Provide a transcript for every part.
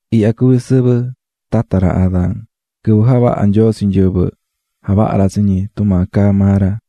Ihya cuví sɨvɨ tata ra Adán. Quɨvɨ javaha̱ Nyoo tsi nyɨvɨ, javaha̱ ra tsi ñi tumaa caá maa ra.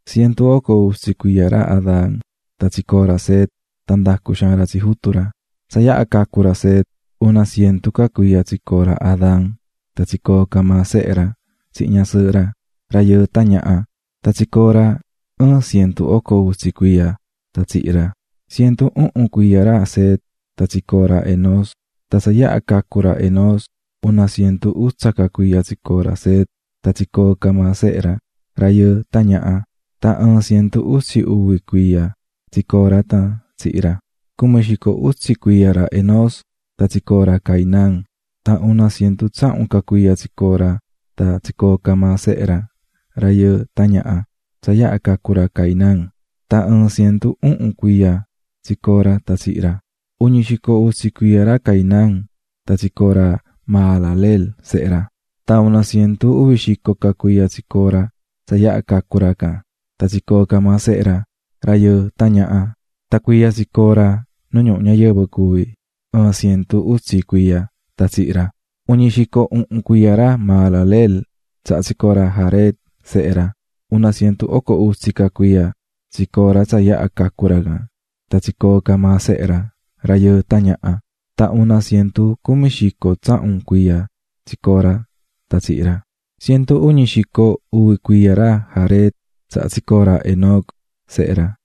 Cientu oco utsi cuiya ra Adán tan tsicoo̱ ra Set sehe ra, tan ndacu̱ xaan ra tsi ra. Tsa yaha cacu̱ ra Set, una cientu ca cuiya tsicoo̱ ra Adán tan tsicoo̱ ca maa sehe ra tsihin ñasɨɨhɨ ra, rayɨɨ tan ñaha. Tan tsicoo̱ ra ɨɨn cientu oco utsi cuiya tan tsihi̱ ra. Cientu uhun cuiya ra Set tan tsicoo̱ ra Enós. Tan tsa yaha cacu̱ ra Enós, una cientu utsa ca cuiya tsicoo̱ ra Set, tan tsicoo̱ ca maa sehe ra, rayɨɨ tan ñaha. Tan ɨɨn cientu utsi uvi cuiya tsicoo̱ ra tan tsihi̱ ra. Cumi xico utsi cuiya ra Enós tan tsicoo̱ ra Cainán. Tan una cientu tsahun ca cuiya tsicoo̱ ra tan tsicoo̱ ca maa sehe ra, rayɨɨ tan ñaha, tsa yaha cacu̱ ra Cainán. Tan ɨɨn cientu uhun cuiya tsicoo̱ ra tan tsihi̱ ra. Uñi xico utsi cuiya ra Cainán tan tsicoo̱ ra Mahalaleel, sehe ra. Tan una cientu uvi xico ca cuiya tsicoo̱ ra tsa yaha cacu̱ ra can, tan tsicoo̱ ca maa sehe ra, rayɨɨ tan ñaha. Tan cuiya tsicoo̱ ra nu ñuhu ñayɨvɨ cuví ɨɨn cientu utsi cuiya tan tsihi̱ ra. Uñi xico uhun cuiya ra Mahalaleel tsaha tsicoo̱ ra Jared, sehe ra. Una cientu oco utsi ca cuiya tsicoo̱ ra tsa yaha cacu̱ ra can, tan tsicoo̱ ca maa sehe ra, rayɨɨ tan ñaha. Tan una cientu cumi xico tsahun cuiya tsicoo̱ ra tan tsihi̱ ra. Cientu uñi xico uvi cuiya ra Jared tsaha tsicoo̱ ra Enoc, sehe ra.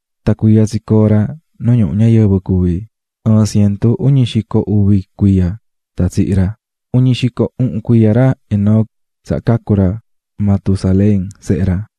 Tan cuiya tsicoo̱ ra nu ñuhu ñayɨvɨ cuví, ɨɨn cientu uñi xico uvi cuiya tan tsihi̱ ra. Uñi xico uhun cuiya ra Enoc tsaha cacu̱ ra Matusalén, sehe ra.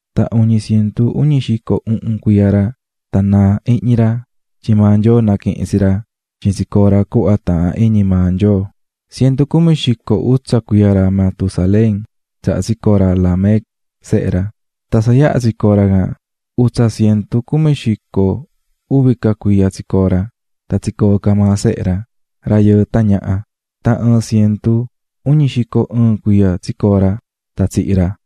Tan uñi cientu uñi xico uhun cuiya ra tan naa̱ ihñi ra tyin maa Nyoo naquihi̱n tsi ra tyin tsicoo̱ ra cuhva taahán iñi maa Nyoo. Cientu cumi xico utsa cuiya ra Matusalén tsaha tsicoo̱ ra Lamec, sehe ra. Tan tsa yaha tsicoo̱ ra can, utsa cientu cumi xico uvi ca cuiya tsicoo̱ ra, tan tsicoo̱ ca maa sehe ra, rayɨɨ tan ñaha. Tan ɨɨn cientu uñi xico ɨɨn cuiya tsicoo̱ ra tan tsihi̱ ra.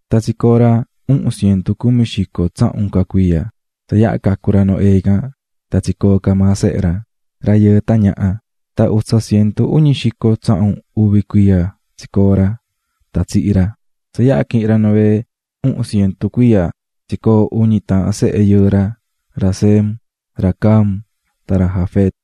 Tan tsicoo̱ ra uhun cientu cumi xico tsahun ca cuiya, tsa yaha cacu̱ ra Noé can, tan tsicoo̱ ca maa sehe ra, rayɨɨ tan ñaha. Tan utsa cientu uñi xico tsahun uvi cuiya tsicoo̱ ra tan tsihi̱ ra. Tsa yaha quihi̱n ra Noé uhun cientu cuiya tsicoo̱ uñi taahan sehe yɨɨ ra, ra Sem, ra Cam, tan ra Jafet.